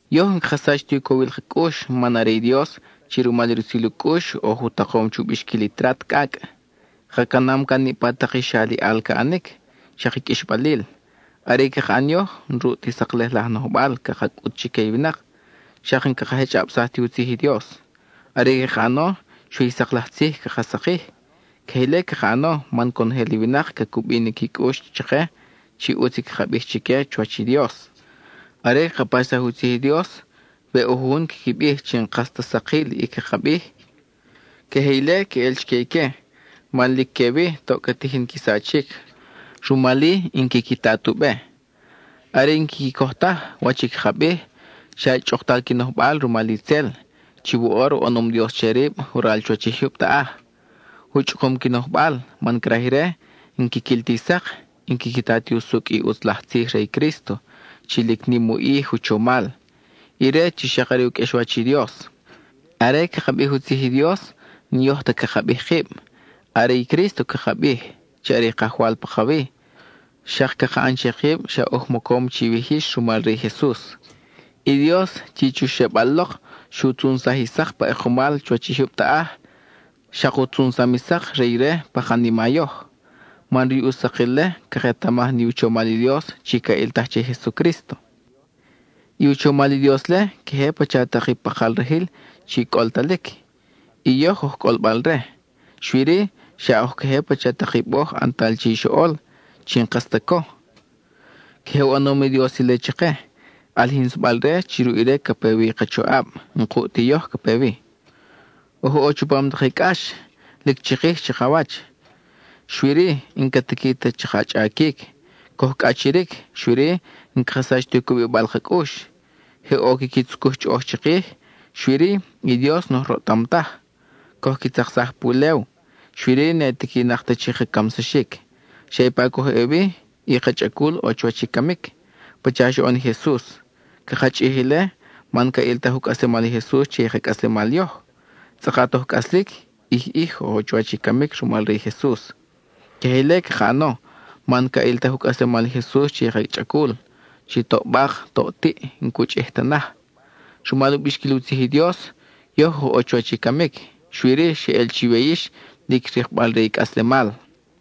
Yoj n-caka sach ti u cowil ka cʼux man are i Dios chi, rumal i rutzil u cʼux, oj u takom chu bixquil i trat cʼacʼ. Ka canam can niʼpa tak i xa aliʼal ca ʼanic, xak i qʼuixbalil. Are i caka ʼan yoj, n-ruʼ ti saklej laj nojbal caka cʼut chique i winak, xak n-caka jechʼabsaj ti u tzij i Dios. Are i caka ʼano, xui i sak laj tzij caka sakij; queje ile caka ʼano man conojel i winak ca cubi ni qui cʼux chake, chi ʼutz i caka bij chique chuwach i Dios. Are caka paxsaj i u tzij i Dios, we ʼo jujun quiqui bij chi n-kas ta sakil i caka bij, queje ile queʼel chique ique man lic que-wi toʼ ca tijin qui sachic; rumal-i n-quiqui ta tu be. Are i n-quiqui coj taj wach i caka bij, xa chʼuktal qui nojbal rumal itzel, chi woʼor u ʼanom dios che rib waral chuwach i jyub taʼaj. U chʼukum qui nojbal, man craj ire n-quiquil ti sak, n-quiqui ta ti usucʼ i ʼutz laj tzij re i Crísto chi lic nim u ʼij u chomal, ire chi xak are u qʼuexwach i Dios. Are caka bij u tzij i Dios, n-yoj ta caka bij kib; are i Crísto caka bij, chi are i Kajwal pakawi; xak caka ʼan che kib xa oj mocom chiwij yix rumal re i Jesus. I Dios, chi chu xebal lok, xu tzunsaj i sak pa ʼekumal chuwach i jyub taʼaj, xak u tzunsam i sak re ire pa kanima yoj, man ruʼ i u sakil-le, caketamaj ni u chomal i Dios chi ca ʼiltaj che i Jesucrísto. I u chomal i Dios-le, queje pacha tak i pakal rajil chi cʼoltalic, y yoj oj cʼolbal-re; xui-ri, xa oj queje pacha tak i boj ʼantal che i xoʼol, chi n-kas ta co. Queje u ʼanom i Dios ile chake, ʼalijinsabal-re chi ruʼ ire ca pe wi i ka choʼab, n-kuʼ ti yoj ca pe wi. Oj ʼo chupam tak i cʼax, lic chikij chakawach, xui-ri, n-ca tiqui ta chaka chʼaquic; coj cʼachiric, xui-ri, n-caka sach ti u cubibal ka cʼux. Je ʼo quiqui tzucuj chʼoʼoj chikij, xui-ri, i Dios n-oj roʼtam taj. Coj qui tzaksaj pulew, xui-ri, ne tiquinak ta chi ka camsaxic. Xa ipa coj ʼe wi, i ka chʼacul ʼo chuwach i camic, pacha xoʼon i Jesus. Caka chʼij ile man ca ʼiltaj u cʼaslemal i Jesus che i ka cʼaslemal yoj. Tzʼakat oj cʼaslic, ʼij ʼij oj ʼo chuwach i camic rumal re i Jesus. Queje ile caka ʼano, man ca ʼiltaj u cʼaslemal i Jesus che i ka chʼacul, chi toʼ bak, toʼ tiʼ, n-cu chʼij ta naj. Rumal u bixquil u tzij i Dios, yoj oj ʼo chuwach i camic, xui-ri xeʼel chiwe yix lic rikbal re i cʼaslemal.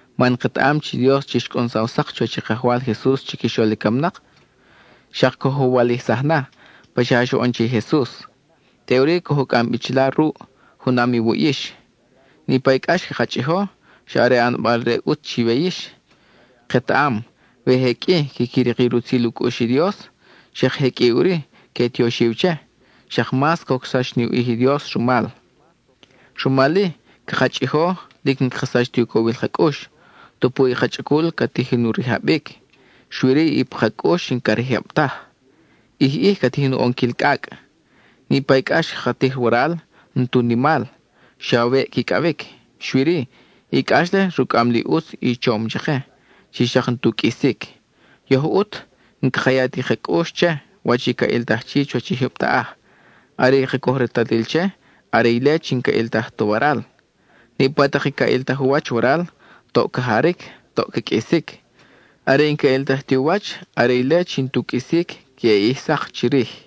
Man ketaʼam chi i Dios chi xcʼunsaw sak chuwach i Kajwal Jesus chiquixol i camnak, xak coj u walijsaj na, pacha xoʼon che i Jesus. Teʼuri, coj u cʼam bi chila ruʼ, junam iwuʼ yix. Niʼpa i cʼax caka chʼijo, xa are ʼanbal re i ʼutz chiwe yix; ketaʼam we je qʼui quiqui rik i rutzil u cʼux i Dios, xak je qʼui ʼuri que tioxiw che, xak mas cocsax ni u ʼij i Dios rumal. Rumal-i, caka chʼijo; lic n-caka sach ti u cowil ka cʼux. Tupu i ka chʼacul ca tijin u rijabic, xui-ri i pa ka cʼux n-ca rijab taj; ʼij ʼij ca tijin u ʼonquil cʼacʼ. Niʼpa i cʼax caka tij waral, n-tu nimal, xa weʼ quicʼawic; xui-ri, i cʼax-le rucʼam li ʼutz i chom chake, chi xak n-tu qʼuisic. Yoj ʼut, n-caka ya ti ka cʼux che, wach i ca ʼiltaj chi chuwach i jyub taʼaj; are i caka coj retalil che, are ile chi n-ca ʼiltaj ta waral. Niʼpa tak i ca ʼiltaj u wach waral, toʼ ca jaric, toʼ ca qʼuisic; are i n-ca ʼiltaj ti u wach, are ile chi n-tu qʼuisic queʼe ʼij sak chirij.